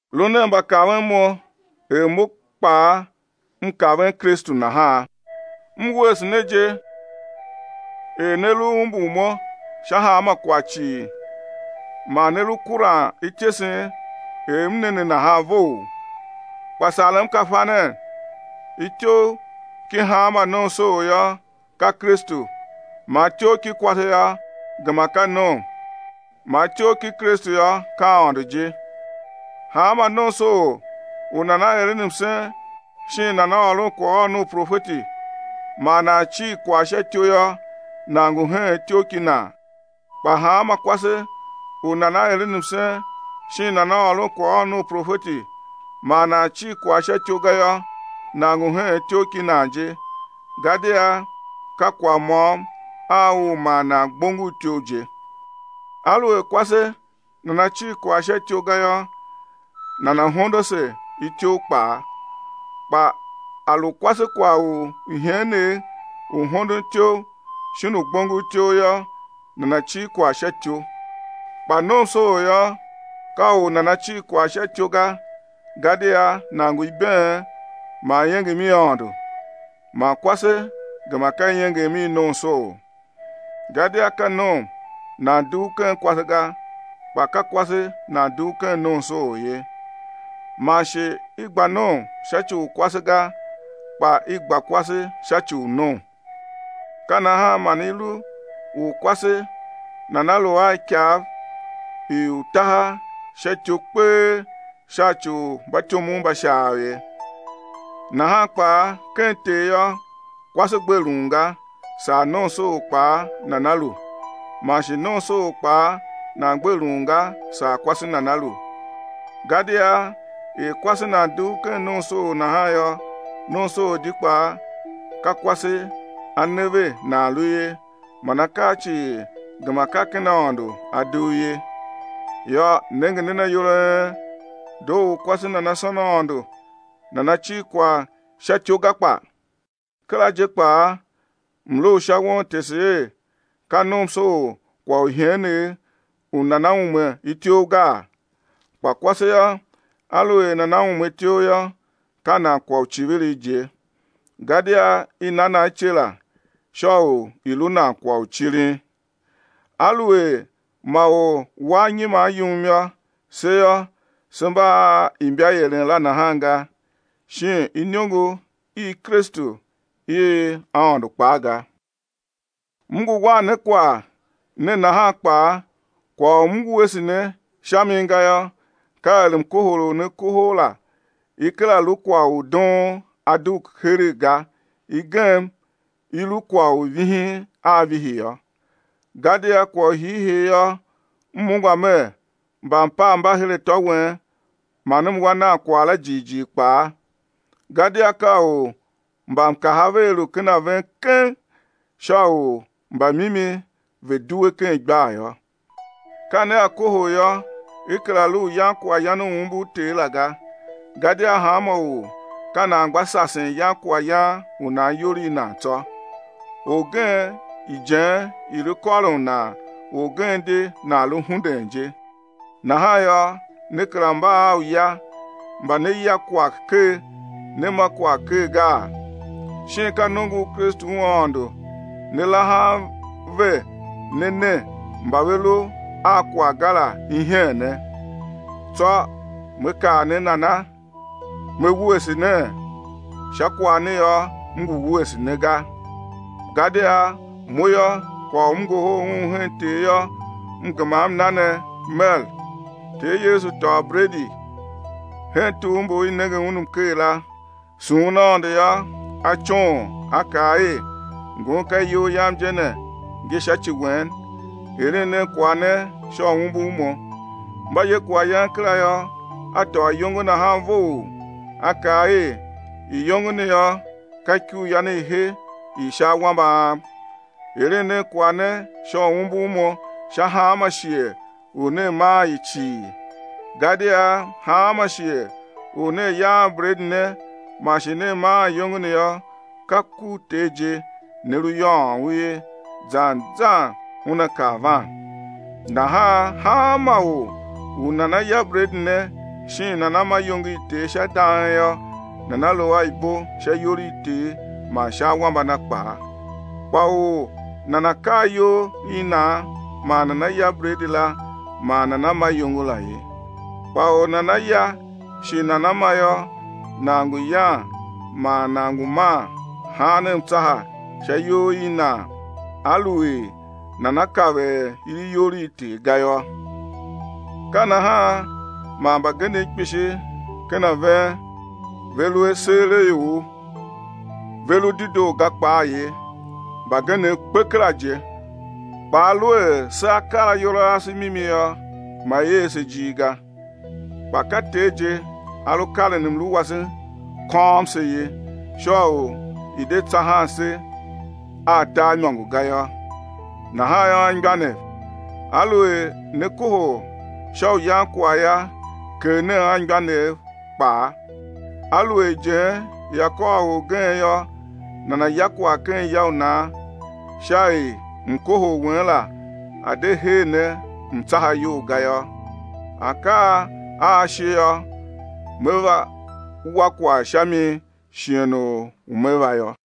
Lu nen mbakaven mo er mo kpaa, m kaven Kristu nahan. M wuese ne je er ne lu umbur mo sha hanma kwagh cii, man ne lu kuran ityesen er m ne ne nahan vough. Kpa sarem ka fa nen, ityough ki hanma nomsoor yô, ka Kristu, man ityough ki kwase yô, gema ka nom, man ityough ki Kristu yô, ka Aôndo je. Hanma nomsoor u nana eren msen shin nana ôron kwaghôron u profeti man nan cir kwagh sha ityou yô, nan ngu heen ityough ki nan. Kpa hanma kwase u nana eren msen shin nana ôron kwaghôron u profeti man nan cir kwagh sha ityou ga yô, nan ngu heen ityough ki nan je, gadia ka kwagh môm a u ma nan gbongor ityough je. Aluer kwase nana cir kwagh sha ityou ga yô, nana̱ hondo ase ityough kpaa. Kpa a lu kwase kwagh u iheenegh u hondon ityough shin u gbongor ityough yô, nana̱ cir kwagh sha ityou. Kpa nomsoor yô, ka u nana cir kwagh sha ityough ga gadia nan ngu ibeen man iengem i Aôndo, man kwase gema ka iengem i nomsoor. Gadia ka nom nan dugh ken kwase ga, kpa ka kwase nan dugh ken nomsoor ye. Man shi i gba nom sha ci u kwase ga, kpa i gba kwase sha ci u nom. Ka nahan man i lu u kwase nana̱ lu a ikav i utaha sha ityou kpee sha ci u mbatyomov mba Shaav ye. Nahan kpaa ken Ter yô, kwase gbe lun ga, saa nomsoor kpaa nana lu, man shi nomsoor kpaa nan gbe lun ga, saa kwase nana lu. Gadia er kwase nan dugh ken nomsoor nahan yô, nomsoor di kpaa ka kwase a ne ve nan lu ye; man akaa cii gema ka ken Aôndo a dugh ye. Yô, nenge nen ayol a en: Doo u kwase nana sôn Aôndo nana cir kwagh sha ityou ga kpa? Kera je kpaa mlu u sha won tese er ka nomsoor kwagh u iheenegh u nana ume ityough gaa? Kpa kwase yô, aluer nana ume ityough yô, ka nan kwagh u icivirigh je. Gadia i na nan ice la sha u i̱ lu nan kwagh u cirin. Aluer ma or wa anyiman yum yô, se yô, se mba a imbaieren la nahan ga, shin iniongo i Kristu i Aôndo kpaa ga. M ngu wan ne kwagh ne nahan kpaa, kwagh u m wuese ne sha mi gayô, ka er mkohol u ne kohol la i kera lu kwagh u doon a dugh heregh ga, i gem i lu kwagh u vihin a vihi yô. Gadia kwagh u hiihii yô, m ungwa mer, mbampav mba her atô wen man m wa nan kwagh la jighjigh kpaa. Gadia ka u mbamkaha vea lu ken a ven keng sha u mbamimi ve̱ due ken igbar yô. Ka nea kohol yô, i kera lu u yan kwaghyan u umbur Ter la ga. Gadia hanma or ka nan gba sasen yan kwaghyan u nan iyol i nan tsô. Orgen ijen i lu kôron nan orgen di nan lu hunden je. Nahan yô, ne kera mba a uya mba né ya kwagh ker, né ma kwagh ker gaa? Shin ka nongo u Kristu u Aôndo ne lahan ve ne ne mba ve lu a kwagh ga la iheene? Tsô me kaa ne nana? Me wuese nee? Sha kwagh ne yô, m ngu wuese ne ga. Gadia mo yô, kwagh u m ngohol un hen Ter yô, m gema m na ne mer: Ter Yesu tôô bredi hen tugh mbu i nenge Un mker la, sughun Aôndo yô, A coon A kaa er: Ngun ka iyol Yam je ne, ngi sha ci wen. Eren nen kwagh ne sha u umbur Mo. Mba ye kwaghyan kera yô, A tôô iyongo nahan vough A kaa er: Iyongo ne yô, ka Ikuryan i he i sha awambe Am. Eren nen kwagh ne sha u umbur Mo sha hanma shighe u nea maan i cii. Gadia hanma shighe u nea yaan bredi ne man shi nea maan iyôngo ne yô, ka ku u Ter je ne lu yôôn u ye; zan zan Una kar van. Nahan hanma or u nana ya bredi ne shin nana ma iyongo i Ter sha dang yô, nana lu a ibo sha iyol i Ter man sha awambe a Na kpaa. Kpa or nana̱ kar iyol i nan man nana ya bredi la man nana ma iyongo la ye. Kpa u nana ya shi nana ma yô, nan ngu yan man nan ngu man haan mtsaha sha iyol i nan aluer nana kav er i lu iyol i Ter ga yô. Ka nahan man mbagenev kpishi ken a ven ve lu aseeraior, ve lu dedoo ga kpaa ye, mbagenev kpe kera je. Kpa aluer sea kar ayol a ase mimi yô, ma i er se ijir ga. Kpa ka Ter je A lu karen mlu wase kôôm se ye, sha u i̱ de tsahan se a tar imôngo ga yô. Nahan yô, anmgbianev, aluer ne kohol sha u yan kwagh yô, kegh nen anmgbianev kpaa. Aluer ijen ia kôr orgen yô, nana̱ ya kwagh ken ya u nan sha er mkohol wen la a̱ de hee ne mtsaha iyol ga yô. Akaa a a shi yô, me va wa kwagh sha mi shighe u me va yô.